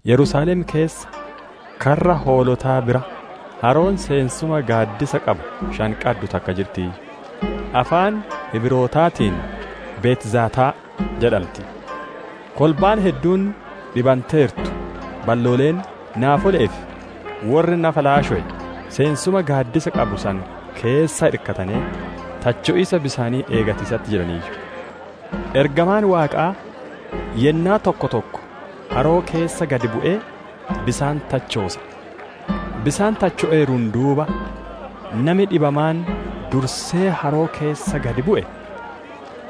Yerusaalem keessa karra hoolotaa bira haroon seensuma gaaddisa qabu shan qaddu takka jirtiiyyu; afaan Hibrootaatiin «Betzataa» jedhanti. Kolbaan hedduun dhibanteertu, ballooleen, naafole'ee fi worri nafa laashowe seensuma gaaddisa qabu san keessa irkatanee [tacho'iisa bisaanii eegatiisatti jiraniiyyu. Ergamaan Waaqaa yennaa tokko tokko haroo keessa gad bu'ee bisaan tachoosa. Bisaan tacho'eeruun duuba nami dhibamaan dursee haroo keessa gad bu'e,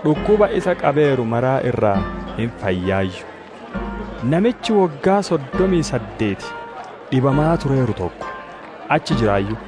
dhukkuba isa qabeeru mara irraa hin fayyaayyu.] Namichi woggaa soddomii saddeeti dhibamaa tureeru tokko achi jiraayyu.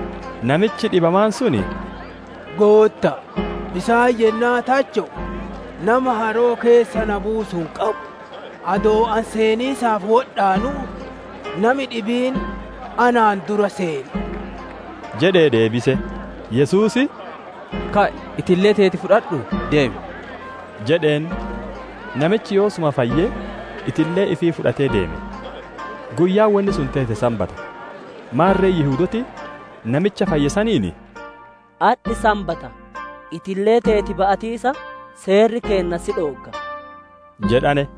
Namichi dhibamaan sun, «Gootta'a, bisaan yennaa tacho'u nama haroo keessa na buusu hin qabu; adoo ani seeniisaaf wodhaanuu, nami dhibiin anaan dura seena» jedhee deebise. Yesuus, «Ka'i, itillee teeti fudhadhuu, deemi» jedheen. Namichi yoosuma fayyee, itillee ifiille fudhatee deeme. Guyyaan wonni sun teete sanbata. Maarre Yihudooti, namicha fayye saniin, «Adhi sanbata; itillee teeti ba'atiisa seerri keenna si dhoogga» jedhane.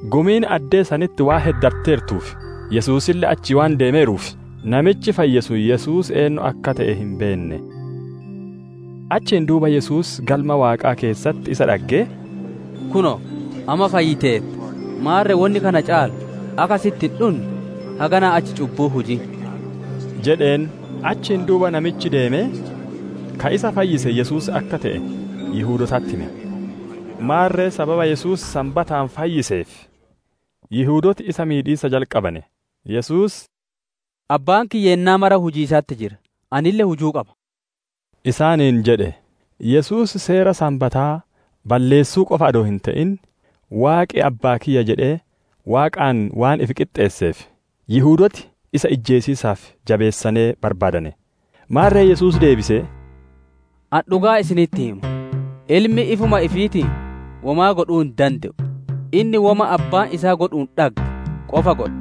Gumiin addee sanitti waan heddatteertuu fi Yesuusille achii waan deemeeruuf, namichi fayye sun Yesuus eennu akka te'e hin beenne. Achiin duuba Yesuus Galma Waaqaa keessatti isa dhaggee, «Kunoo, amma fayyiteerta; maarre wonni kana caalu akka sitti hin dhunne, haganaa achi cubbuu hin hujin» jedheen. Achiin duuba namichi deemee, ka isa fayyise Yesuus akka te'e, Yihudootatti hime. Maarre sababa Yesuus sanbataan fayyiseef, Yihudooti isa miidhiisa jalqabane. Yesuus, «Abbaan kiyya yennaa mara hujiisatti jira; anille hujuu qaba» isaaniin jedhe. Yesuus seera sanbataa balleessuu qofaa adoo hin te'in, Waaqi abbaa kiyya jedhee Waaqaan waan ifi qixxeesseef, Yihudooti isa ijjeesiisaaf jabeessane barbaadane. Maarre Yesuus deebisee, «Ani dhugaa isinitti hima, Ilmi ifuma ifiitiin womaa godhuu hin dande'u; inni woma Abbaan isaa godhuun dhagge qofaa godha.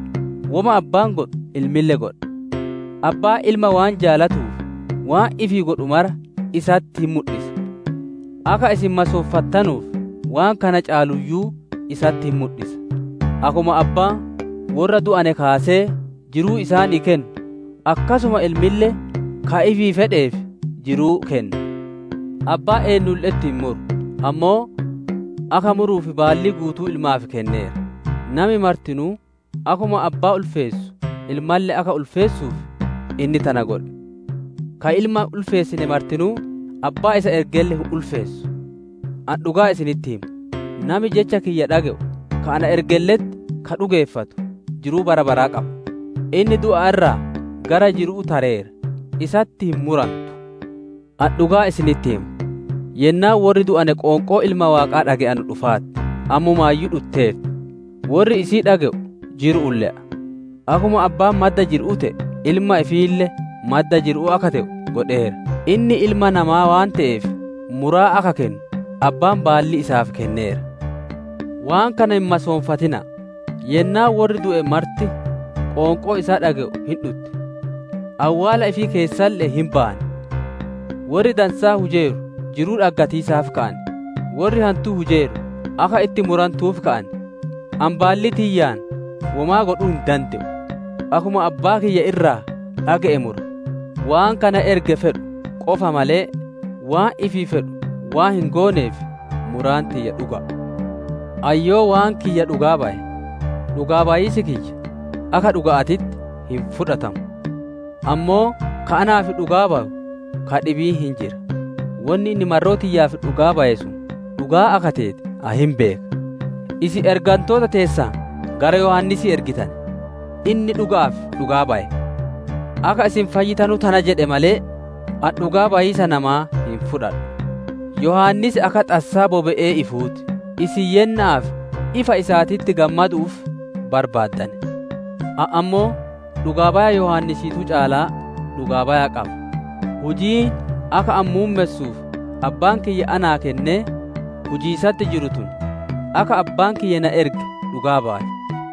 Woma Abbaan godhu, Ilmille godha. Abbaan Ilma waan jaalatuuf, waan ifii godhu mara isatti hin mudhisa. Akka isin masoonfattanuuf, waan kana caaluuyyuu isatti hin mudhisa. Akkuma Abbaan worra du'ane kaasee jiruu isaanii kennu, akkasuma Ilmille ka ifii fedheef jiruu kenna. Abbaan eennulle'etti hin muru, ammoo akka muruuf baallii guutuu Ilmaaf kenneera; Nami martinuu akkuma abbaa ulfeessu Ilmalle akka ulfeessuuf inni tana godhe. Ka Ilma hin ulfeessine martinuu, Abbaa isa ergelle hin ulfeessu. «Ani dhugaa isinitti hima; nami jecha kiyya dhage'u ka na ergelle'etti ka dhugeeffatu jiruu bara baraa qaba; inni du'a irraa gara jiru'uu tareera; isatti hin murantu. Ani dhugaa isinitti hima, yennaan worri du'ane qoonqoo Ilma Waaqaa dhage'anu dhufaarti; ammumaayyuu dhutteerti; worri isii dhage'u jiru'uun le'a. Akkuma Abbaan madda jiru'uu te'e, Ilma ifiille madda jiru'uu akka te'u godheera. Inni Ilma Namaa waan te'eef, muraa akka kennu, Abbaan baallii isaaf kenneera. Waan kana hin masoonfatina'a; yennaan worri du'e marti qoonqoo isaa dhage'u hin dhutti; awwaala ifii keessaalle'ee hin bayan; worri dansaa hujeeru jiruu dhaggatiisaaf ka'an; worri hantuu hujeeru akka itti murantuuf ka'an. «Ani baallii tiyyaan womaa godhuu hin dande'u. Akkuma Abbaa kiyya irraa dhage'e mura; waan ka na erge fedhu qofa malee, waan ifii fedhu waan hin gooneef, muraan tiyya dhuga'a. «Ani yoo waan kiyya dhugaa baye, dhugaa bayiisi kiyya akka dhuga'aatitti hin fudhatamu. Ammoo ka anaaf dhugaa bayu ka dhibiin hin jira, wonni inni marroo tiyyaaf dhugaa baye sun dhugaa akka teete ani hin beeka. Isin ergantoota teessan gara Yohaannisii ergitane; inni dhuga'aaf dhugaa baye. Akka isin fayyitanu tana jedhe malee, ani dhugaa bayiisa namaa hin fudhadhu. Yohaannis akka xassaa bobe'ee ifuu ti; isin yenna'aaf ifa isaatitti gammadu'uuf barbaaddane. Ani ammoo dhugaa baya Yohaannisiituu caalaa dhugaa baya qaba; hujiin akka ani muummessuuf Abbaan kiyya naa kennee, hujiisatti jiru tun, akka Abbaan kiyya na erge dhugaa baati.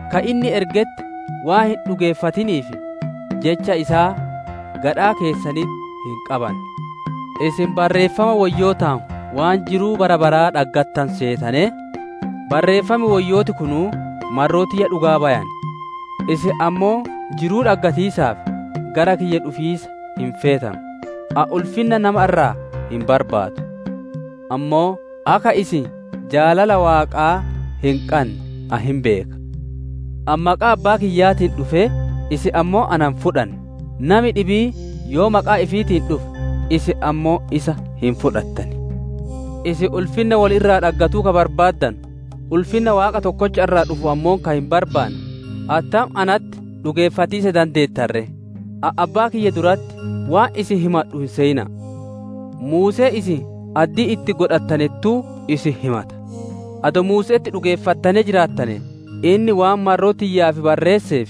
ka inni ergetti waan hin dhugeeffatiniif, jecha isaa gadhaa keessanitti hin qabanne. Isin Barreeffama Woyyootaan waan jiruu bara baraa dhaggattanu seetanee, Barreeffama Woyyoota qorqortan. Barreeffam Woyyooti kunuu marroo tiyya dhugaa bayan! Isin ammoo jiruu dhaggatiisaaf gara kiyya dhufiisa hin feetanu! «Ani ulfinna nama irraa hin barbaadu. Ammoo akka isin jaalala Waaqaa hin qanne ani hin beeka. Ani maqaa Abbaa kiyyaatiin dhufee, isin ammoo na hin fudhanne; nami dhibiin yoo maqaa ifiitiin dhufe, isin ammoo isa hin fudhattan. Isin ulfinna wolii irraa dhaggatuu ka barbaaddanu, ulfinna Waaqa tokkocha irraa dhufu ammoo ka hin barbaanne, attam natti dhugeeffatiisa dandeettan ree? Ani Abbaa kiyya duratti waan isin himadhu hin seyina'a. Muusee isin addii itti godhattanettuu isin himata. Adoo Muuse'etti dhugeeffattanee jiraattane, inni waan marroo tiyyaaf barreesseef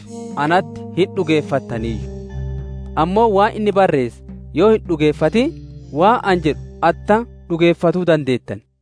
natti hin dhugeeffattaniiyyu. Ammoo waan inni barreesse yoo hin dhugeeffatin, waan ani jedhu attam dhugeeffatuu dandeettan?» jedhe.